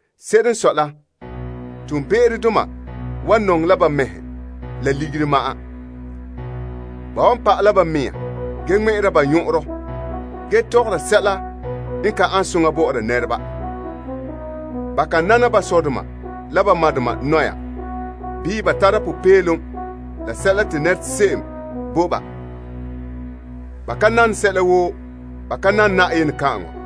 Se'ere n sɔe la, toonbe'erodoma wan nɔŋɛ la ba mɛhe la ligiri ma'an. Ba wan ŋmɛ'ɛra ba nyɔn'ɔnrɔ ge toora nɛreba, ka nana ba dɔgɔreba, bii ba tara popeelom la sɛla te nɛra se'em bo ba, ka zɔta Na'ayenɛ.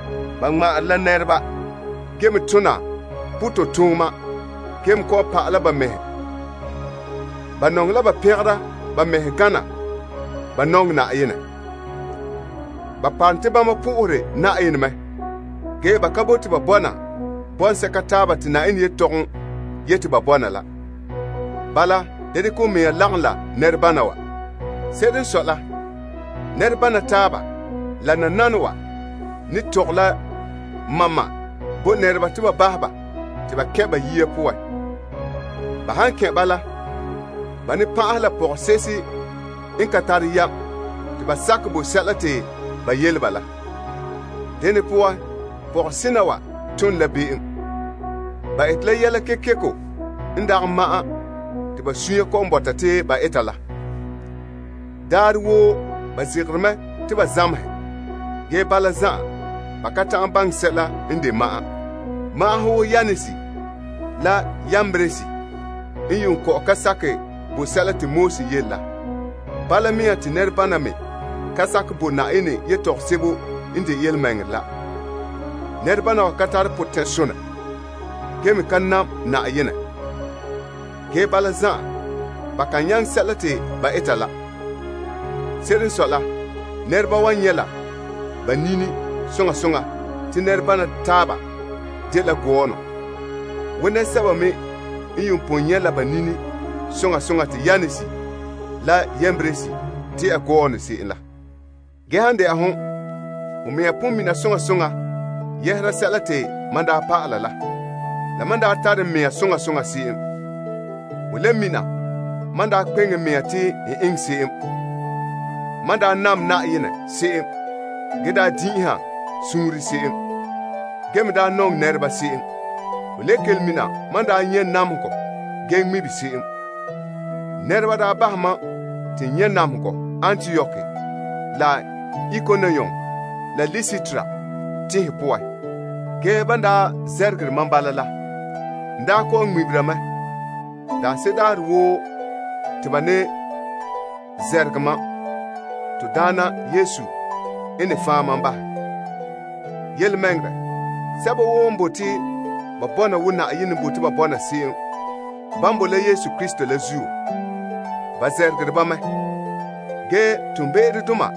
Ba ŋma'anre la nɛreba ge me tona pototooma ge me kɔ'ɔn pa'ala ba mɛhe. Ba nɔŋɛ la ba pɛngera ba mɛhe gana ba nɔŋɛ Yenɛ. Ba parom te bama po'ohere Yenɛ mɛ, ge ba ka bote ba bɔna bɔŋsɛka taaba te Yenɛ yetɔgom yete ba bɔna la. Bala, da dekɛ ho mea lagom la nɛrebana wa. Se'ere n sɔe la, nɛrebana taaba, la nananawa ne tɔgɛ la ma'ma' bo nɛreba te ba bahɛ ba te ba kɛn' ba yiya poan. Ba han kɛn' bala, ba ne pan'ahɛ la pɔgɔse'ehe n ka tare yam te ba sakɛ bo sɛla te ba yele ba la. Dena poan, pɔgɔse'ehe wa tom la be'em. Ba ete la yɛla kekeko n dagɛ ma'an te ba sunya kɔ'ɔn bɔta te ba eta la. Daarɛ woo pɔgɔhe wa zegere mɛ te ba zamehɛ, ge bala zan'an, ba ka ta'an baŋɛ sɛla n de ma'an. Magahɛ wo Yanes la Yambres n yuun kɔ'ɔn ka sakɛ bo sɛla te Moses yele la, bala mea te nɛrebana me ka sakɛ bo Yenɛ yetɔgom sebo n de yelemɛŋɛrɛ la. Nɛrebana wa ka tare potɛn'sonɛ ge me ka nam Yenɛ. Ge bala zan'an, ba kan nyaŋɛ sɛla te ba eta la. Se'ere n sɔe la, nɛreba wan nyɛ' la ba nini soŋa soŋa te nɛrebana taaba dela gɔɔnɔ, wo nɛresɛba me n yuun pon nyɛ' la ba nini soŋa soŋa te Yanes la Yambres dela gɔɔnɔ se'em. Ge han de'a hon, ho mea pon mina soŋa soŋa yɛhera sɛla te mam daa pa'ala la, la mam n daa tare n mea soŋa soŋa se'em, ho le mina mam n daa kpeŋe n mea te n eŋɛ se'em. Ho nyɛ mam daa nam Yenɛ se'em ge daa din'inha suunre se'em, ge me daa nɔŋɛ nɛreba se'em. Ho le kelom mina mam daa nyɛ' namehegɔ ge ŋmibe se'em. Nɛreba daa bahɛ mam te n nyɛ' namehegɔ Antiok la Ikonium la Listra tenhen poan. Ge, ban daa namehɛ mam bala la, n daa kɔ'ɔn ŋmɛ'ɛra mɛ. Daanse'ere daarɛ woo te ba ne namehɛ mam, Na'ayenɛ n ne fan' mam bahɛ. Yelemɛŋɛrɛ, sɛba woo n bote ba bɔna wo Yenɛ n bote ba bɔna se'em, ban bo la Krista Yesu la zuo la, ba nameherɛ ba mɛ. Ge toonbe'erodoma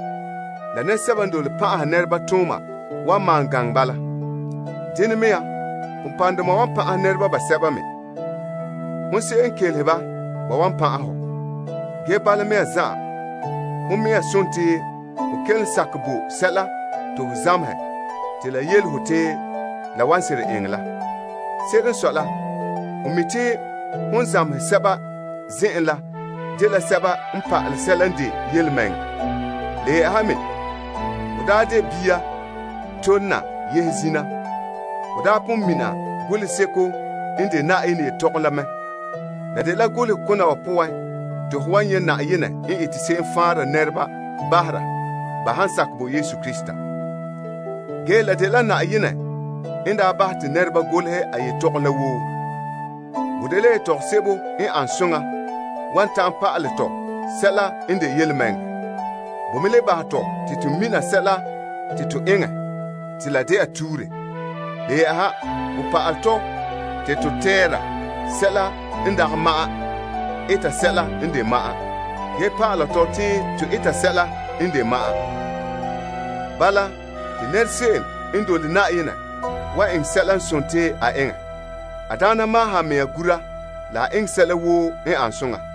la nɛresɛba n dole pan'aha nɛreba wan malom gaŋɛ bala. Dene mea, ponpɔrɔŋdoma wan pan'ahɛ nɛreba basɛba me. Hon se'em n kelehe ba, ba wan pan'ahɛ hɔ. Ge bala mea zan'an, hon mea sontii ho kelom sakɛ bo sɛla to ho zamehɛ te la yele ho te la wan seren eŋɛ la. Se'ere n sɔe la, ho mi' te hon zamehere sɛba zen'en la dela sɛba n pa'alɛ sɛla n de yelemɛŋɛrɛ. Le yɛ'ɛha me, hon daa de bia tole na yehe zina, ho daa pon mina Toolom Golehegɔ la mɛ. La dela golokona wa poan te ho wan nyɛ' Yenɛ n ete se'em faanra nɛreba bahera ba han sakɛ bo Krista Yesu. Ge la dela Yenɛ n daa bahɛ te nɛreba golehɛ a yetɔgom la woo. Bo dela yetɔgom sebo n an soŋa wan ta'an pa'alɛ tɔ sɛla n de yelemɛŋɛrɛ. Bo me le bahɛ tɔ, te to mina sɛla te to eŋɛ te la de'a tuure. Le yɛ'ɛha bo pa'alɛ tɔ te to tɛɛra sɛla n dagɛ ma'an eta sɛla n de ma'an, ge pa'ala tɔ te to eta sɛla n de ma'an. Bala, te nɛra se'em n dole Yenɛ wan eŋɛ sɛla n de a eŋɛ. A daana maahom a mea gura la a eŋɛ sɛla woo n ane soŋa.